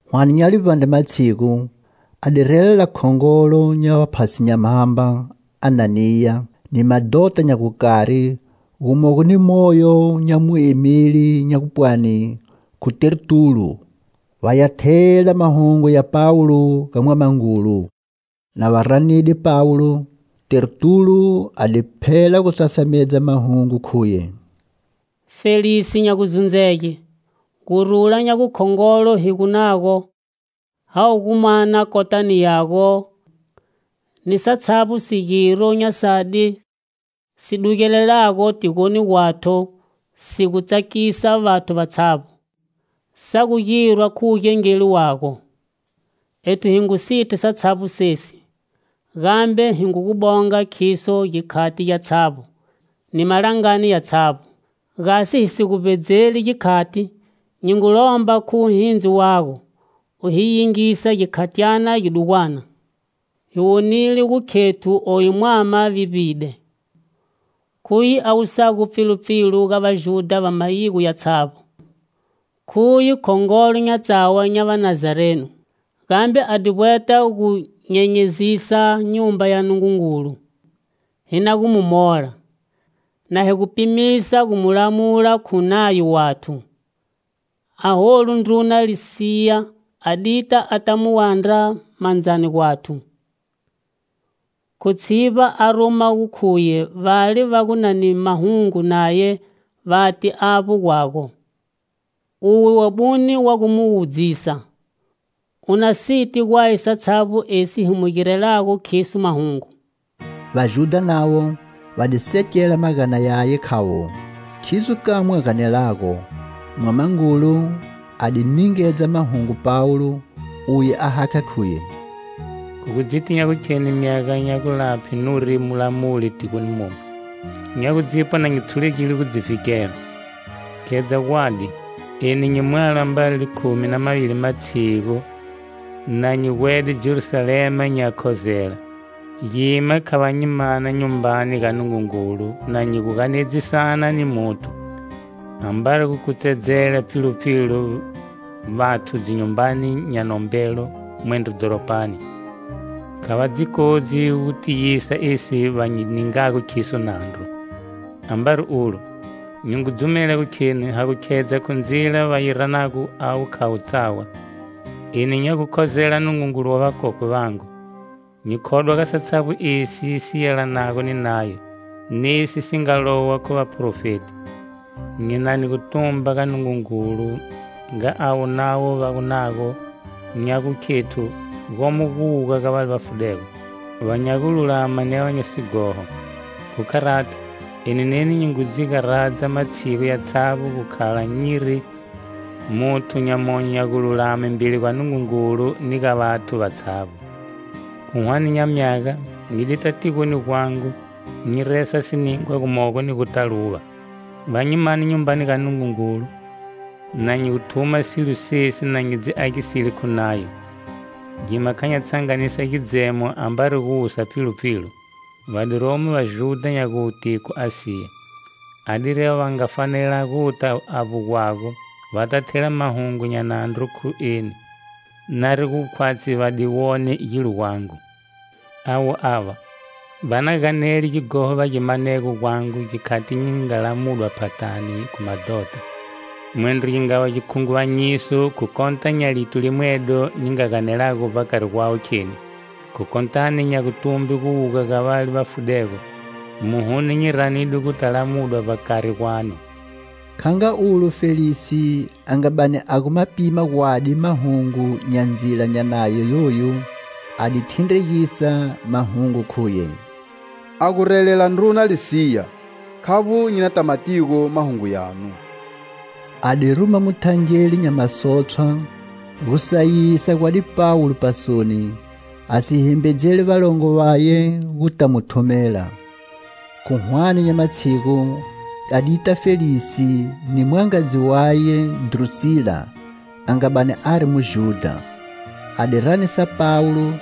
Hwane nya livbandre matshigu, a di relela khongolo nya vaphasi nya mhamba, Ananiya, ni madhota nya gukari gumogo ni moyo nya muemeli nya gupwani khu Tertulo, va ya thela mahungu ya Pawulo ga mwamangulu. Na va ranide Pawulo, Tertulo a di phela gu sasamedza mahungu khuye: "Felisi nya guzundzege, gurula nya gukhongolo hi gu nago ha gu gu mana kotani yago ni satshavbo sigiro nya sadi si dugelelago tigoni gwathu si gu tsakisa vathu vatshavbo, sa gu girwa khu wugengeli wago. Ethu hi ngu siti satshavbo sesi, gambe hi ngu gu bonga khiso gikhati gyatshavbo ni malangani yatshavbo. Gasi hi si gu vbedzeli gikhati, nyi ngu lomba khu wuhindzi wago, u hi yingise gikhatyana gidugwana. Hi wonile gu khethu oyu mwama vivbide. Khuye a wusago pfilupfilu ga Vajudha va mayigo yatshavbo. Khuye khongolo nya tsawa nya Vanazarenu. Gambe a di vbweta gu nyenyezisa Nyumba ya Nungungulu, hi na gu mu mola [na higu pimisa gu mu lamula khu Nayo wathu. Aholu ndruna Lisiya a dita a ta mu wandra mandzani gwathu, khu tshivba a ruma gu khuye vale va gu na ni mahungu naye vate avbo gwago.] Uwe wabune wa gu mu wudzisa, u na siti gwaye satshavbo esi hi mu girelago khiso mahungu." Vajudha navo va di sekela magana yaye khavo khidzo kamwe a ganelago. Mwamangulu a di ningedza mahungu Pawulo, uye a hakha khuye: "Khu gu dziti nya gukheni myaga nya gulaphe nuri mulamuli tigoni momu, nya gu dzipwa na nyi tshulegile gu dzi vhikela. Khedza gwadi: eni nyi mwalo ambari likhumi na mavili matshigu na nyi gwede Jerusalema nyi ya khozela. Gima kha va nyi mana Nyumbani ga Nungungulu na nyi gu ganedzisana ni muthu, ambari gu kutsedzela pfilupfilu vathu dzinyumbani nya nombelo mwendro dhoropani. Kha va dzi kodzi gu tiyisa esi va nyi ningago khiso nandru. Ambari ulo, nyi ngu dzumela gu kheni ha gu khedza khu Ndzila va yi ranago avo khavo tsawa, eni nya gu khozela Nungungulu wa vakokwe vangu, nyi khodwa ga satshavbo esi si yelanago ni Nayo, nesi si nga lowa khu vaprofeti. Nyinani gutumba ga Nungungulu nga avo navo va gu nago nya gu khethu gomo guwuga ga vale va fudego, va nya gululama ni va nya sighoho. Khu kharato, eni neni nyi ngu dzi garadza matshigu yatshavbo gu khala nyiri muthu nya monyo nya gululame mbeli gwa Nungungulu ni ga vathu vatshavbo. Khu hwane nya myaga, nyi dita tigoni gwangu nyi resa siningwa gumogo ni gu ta luva. Va nyi mane Nyumbani ga Nungungulu, na nyi gu thuma silo sesi, na nyi dzi agiside khu Nayo, gima kha nya tshanganisa gidzemo ambari gu wusa pfilupfilu. Va di romo Vajudha nya gute khu Asiya, adiri avo va nga fanela guta avbo gwago va ta thela mahungu nya nandru khu eni, nari gu khwatshi va di wone gilo gwangu. Avo ava, va na ganele gighoho va gi manego gwangu gikhati nyi nga lamudwa phathani khu madhota. Mwendro gi nga va gikhunguvanyiso khu kota nya lito limwedo nyi nga ganelago vbakari gwawe kheni: khu kotani nya gutumbe guwuga ga vale va fudego, muhuno nyi ranidwe gu ta lamudwa vbakari gwanu." Kha nga olu Felisi a nga bani a gu ma pima gwadi mahungu nya Ndzila nya Nayo yoyu, a di thindregisa mahungu khuye: "A gu relela ndruna Lisiya, khavbo nyi na ta matigo mahungu yanu." A di ruma muthangeli nya masotshwa gu sayisa gwadi Pawulo pasoni, a si himbedzeli valongo vaye gu ta mu thumela. Khu hwane nya matshigu, a dita Felisi ni mwangadzi waye Drusila a nga bani ari Mujudha. A di ranisa Pawulo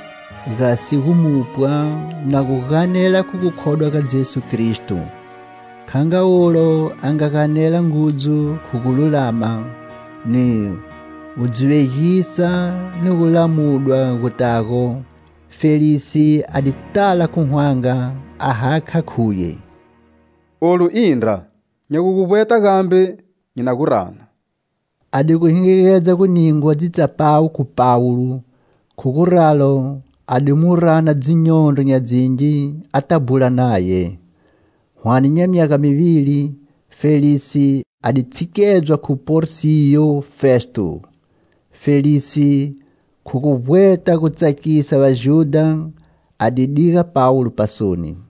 gasi gu mupwa na gu ganela khu gukhodwa ga Jesu Kristo. Kha nga ulo a nga ganela ngudzu khu gululama, ni, gu dzi vegisa ni gulamudwa gu natago, Felisi a di tala khu hwanga, a hakha khuye: "Olu indra. Nya gu gu vbweta gambe nyi na gu rana." A di gu hingigedza gu ningwa dzitsapawu khu Pawulo, khu gu ralo a di mu rana dzinyondro nya dzingi a ta bhula naye. Hwane nya myaga mivili, Felisi a di tshikedzwa khu Porsiyo Festo. Felisi, khu gu vbweta gu tsakisa Vajudha a di diga Pawulo pasoni.